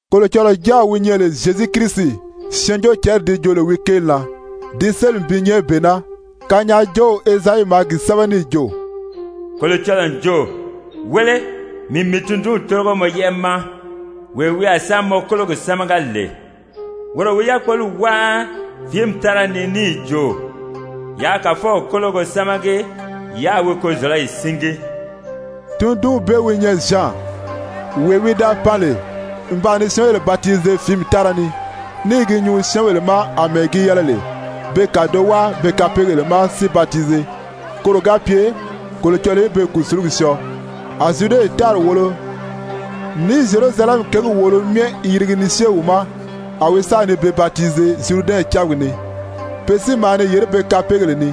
Kolocɔlɔɔ Jáaw wi nyɛ lè Zyezu Kirisi Syɛɛnjóocǎnri di joo lè wi kéeli na, di sélimi bi nyɛ bee naa. Kanyaajoow Ezayi maa gi sɛ́bɛ níì jo: «Kolocɔlɔɔ n jo: ‹Wéle, mii n mii tundunw tórigo mɔ yɛ́ʔɛ ma, wee wi a sa mɔ kólogi sámaga lè. Woro wi yákpoli wáa fìími tára ni níì jo: Yaa Kàfɔw kólogo sámagi yáā wi kozɔ̀lɔyi síngi.›» Tundunw bee wi nyɛ Zyan, wee wi da pan lè n ba ni syɛ́ɛnbèle batize fìími tára ni, ní i gi nyuu syɛ́ɛnbèle ma àmɛɛ gi yɛlɛ lè be kàdoʔo wáa be kapeegèle ma si batize, koro ga pye Kolocɔlɔɔ í be kùsulugi syɔɔ. A Zyude tári wòolo ní Zyerusalɛmi kěgi wòolo myɛ i yirigi ni syée wi ma. A wi sa ni be batize Zyuridɛnw cábiga ni. Pe si maa ni yèré be kapeegèle ni.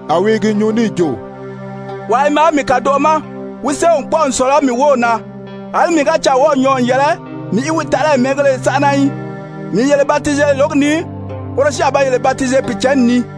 A wi i gi nyuu níì jo: «Wàa i maa mii kàdoʔo ma, wi séew n kpɔ́ʔɔ n sɔ̀lɔ mii wów na. Alí mii ga caa wɔ́ɔ̀ nyɔɔ n yɛlɛ mii í lɛ̀ɛlɛ bi wi taʔalayi mɛ́ɛngéle sánʔana í. Mii n yele batize lǒgi ni, woro si a ba yele batize Pìicǎnni ni.»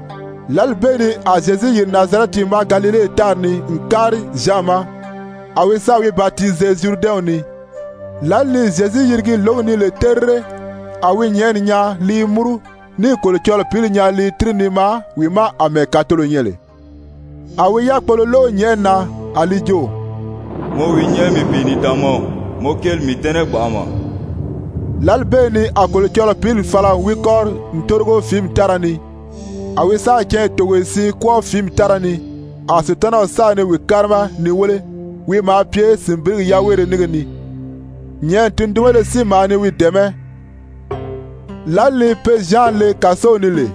Lǎli bee ni a Zyezu yìri Nazarɛti ma Galile tári ni n kári Zyan ma, a wi sáà wi batize Zyuridɛnw ni. Lǎli ni Zyezu yirigi lǒgi ni lè terire, a wi nyɛ̀ʔɛni nyaa li i múru níì Kolocɔlɔɔ Pǐli nyaa li i tíri ni maa wi ma àmɛɛ kàtolo nyɛ lè. A wi yákpolo lóʔo nyɛ̀ʔɛni na, a li jo: «Mɔ wi nyɛ mii Pìinidaanmaw, mɔ kéeli n mii dɛ́nɛ gbanʔama.» Lǎli bee ni a Kolocɔlɔɔ Pǐli fala n wi kɔ́ri n tórigo fìími tára ni. A wi sáà canya togoye siin kwɔ́ɔ fìími tára ni, a Sutanaw sa ni wi kárima ni wéle. Wi maa pye sìnbirigi yaweere nínge ni, nyɛ̀ʔɛni tundunbéle si maa ni wi dɛ̀ɛmɛ́. Lǎli ni pe Zyan le kàsow ni lè,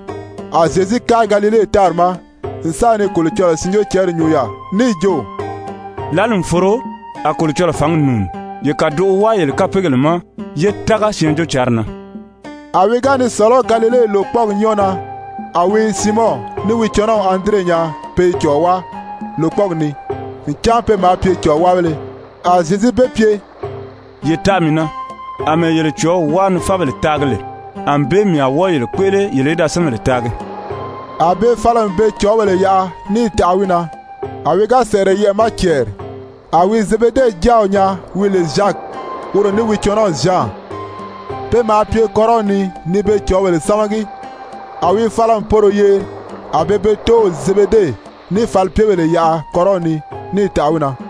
a Zyezu kári Galile tári ma n sa ni Kolocɔlɔɔ Syɛɛnjóocǎnri nyuu yaà níì jo: «Lǎli n foro, a Kolocɔlɔɔ fǎngi nùuni. Ye kàdoʔo wáa yele kapeegèle ma, yé tága Syɛɛnjóocǎnri na.» A wi ga ni sɔ̀lɔ́ Galile lòkpɔɔgi nyɔ́ɔ na, a wi Siimɔn ní wi cɔnɔw Andire nyaa pe i cɔ̀ɔ wáa lòkpɔɔgi ni, ncan pe maa pye cɔ̀ɔwáabéle. A Zyezu be pye: «Ye taʔa mii na. Amɛɛ yele cɔ̀ɔ́w wáa ni fábèle taagi lè, ànbée mii a wɔ́ɔ yele kpéʔele yele í da syɛ́ɛnbèle taagi.» A be fala n be cɔ̀ɔ́bèle yaʔa níì taʔa wi na. A wi ga sɛ̀ʔɛrɛ yɛʔɛ̀ ma cɛɛri, a wi Zebede jáaw nyaa wi lè Zyaki, woro ní wi cɔnɔw Zyan. Pe maa pye kɔ́rɔw ni ni be cɔ̀ɔ́bèle sámagi. A wi fala n poro yeri. A be be tóow Zebede ní falipyebèle yaʔa kɔ́rɔw ni, níì taʔa wi na.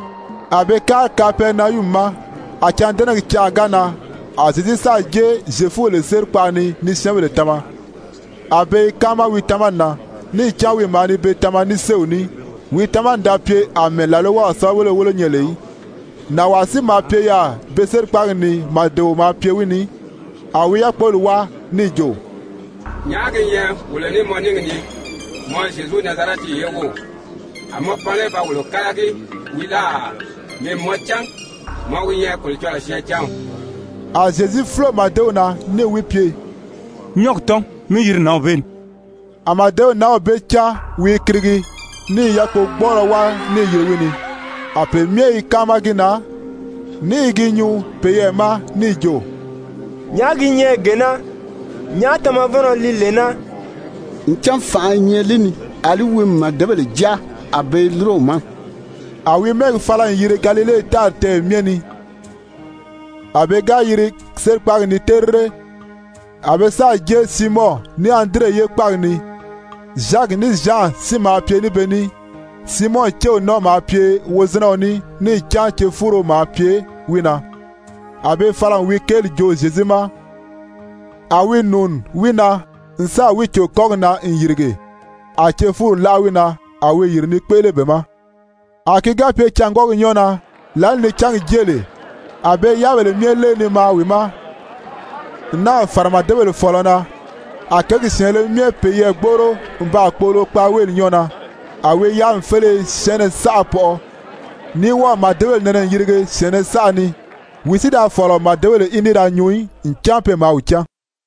A be kári Kapɛrinayumi ma. A cândɛnɛgi canʔa ga nan, a Zyezu sáà jée Zyefubèle sérikpaʔa ni ni syɛ́ɛnbèle tama. A be i káama wi tamani na níì cán wi maa ni be tama ní séew ní. Wi tamani da pye àmɛɛ làlwaw sɛ́bɛwelebéle wólo nyɛ lè í. Nànwaa si maa pye yaà be sérikpaagi ni, màdeo maa pye wi ni, a wi yákpoli wáa níì jo: «Nyàʔá gi nyɛ wolo ní mɔ níngi ni, mɔ Zyezu, Nazarɛti ye wów? A mɔ pan lé ba wolo kálagi wii láà? Mii n mɔ cán, mɔ wi nyɛ Kolocɔlɔɔ syɛɛncanw.» A Zyezu fúlo màdew na níì wi pye: «Nyɔ́ɔgi tɔ́n, mí yiri nǎnw bee ni.» A màdew nǎnw bee cáan wi i kirigi, níì yákpogbɔɔlɔ wáa níì yiri wi ni. A pe myɛ i káama gi na ní i gi nyuu peyɛɛ ma níì jo: «Nyàʔá gi nyɛ gee naa? Nyàʔá tamavɔnnɔ li lee naa? Ncan fànʔa i nyɛ li ni. Alí wi n màdebèle jáa, a be i lúro wi ma.» A wi mɛ́ɛgi fala n yiri Galile tári tɛ́ɛyɛ myɛ ni. A pe ga yiri sérikpaagi ni terire, a be sáà jée Siimɔn ní Andire ye kpáagi ni, Zyaki ní Zyan si maa pye ní be ní. Siimɔn céw nɔ́ɔ maa pye wozinɛɔ ní, níì cán cefuuro maa pye wi na. A be fala n wi kéeli joo Zyezu ma. A wi nùuni wi na n sáà wi cò kɔ́gi na n yìrige, a cefuuri láʔa wi na. A wi yìri ni kpéʔele be ma. A ki ga pye cângwɔɔgi nyɔ́ɔ na, lǎli ni cángi jée lè, a be i yáabèle myɛ lée ni maa wi ma, n náà fàra màdebèle fɔ̀ɔlɔ na. A kěgi syɛ̀ɛnnɛ myɛ peyɛɛ gbóʔoro n baa kpoʔolo kpaaweeli nyɔ́ɔ na. A wi yáami féleye syɛɛnnɛ saʔa pɔʔɔ, ní wɔ́ɔ̀ màdebèle nɛnɛ n yirige syɛ̀ɛnnɛ saʔa ni. Wi si da fɔ̀lɔ màdebèle í ní da nyuu í, ncan pe maa wi cán.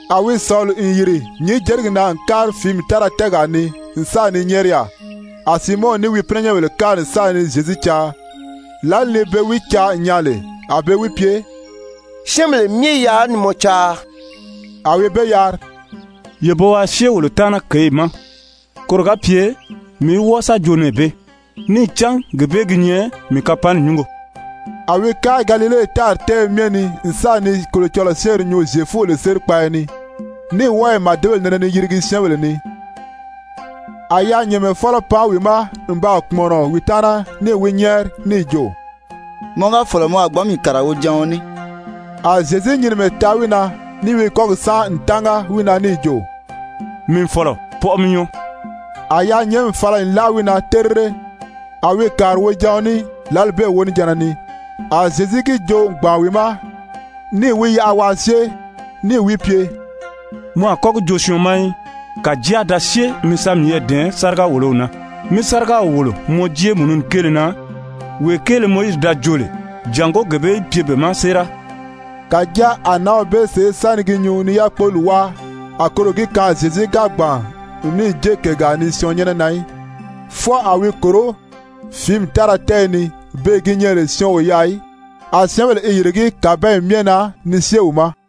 A wi sɔ̀li n yìri nyǐnjerigi na n kári fìími tára tɛ́ɛgaa ni n sa ni nyɛ́ɛri yaà. A Siimɔn ní wi pínɛnyɛnbèle kári n sa ni Zyezu caa. Lǎli ni be wi caa n nyaa lè a be wi pye: «Syɛ́ɛnbèle myɛ i yaà ni mɔ caa.» A wi be yari: «Ye bo waa syée wolo taana kěyi ma, koro ga pye mii í wɔ́ɔ sa joo nɛɛ bee, níì cán gee bee gi nyɛ mii kapanni nyúngo.» A wi kári Galile tári tɛ́ɛyɛ myɛ ni n sa ni Kolocɔlɔɔ syɛ́ɛnri nyuu Zyefubèle sérikpaaya ni, ní wɔ́ɔ i màdebèle nɛnɛ ni yirigi syɛ́ɛnbèle ni. A yaanyɛɛnmɛfɔlɔ pan wi ma n baa kpùmɔnɔ wi taana, níì wi nyɛ́ɛri níì jo: «Mɔ ga fɔ̀lɔ mɔ a gbǎn mii kàriga wojaɔn ní.» A Zyezu nyinimɛ taa wi na níì wi kɔ́gi sánʔa n tánga wi na níì jo: «Mii n fɔ̀lɔ, pɔʔɔ mi nyɔɔ.» A yaanyɛɛnmi fala n láʔa wi na terire, a wi kàri wojaɔn ní. Lǎli bee wonijanna ni a Zyezu gi joo n gbàn wi ma níì wi yaʔa waa syée, níì wi pye: «Mɔ a kɔ́ gi joo syɔɔn ma í. Kàjáa da syée mi sa miyɛɛ dɛ̀ɛn sáriga-wòlow na, mí sárigaw wòlo mɔ jéemununi kéele na, wee kéele Mowizi da joo lè, jàngó gee bee í pye be ma séera.» Kàjáa a nǎnw bee sèʔé sa ni gi nyuu ni yákpoli wáa, a koro gi kaan Zyezu ga gbàn n níì jée kègaa ni syɔɔn nyɛ́nɛ na í, fwɔɔ a wi i kòró fìími tára tɛ́ɛyɛ ni, beè gi nyɛ lè syɔɔn o yaà í. A syɛ́ɛnbèle i yìrigí kàbanyi myɛ na ni syée wi ma.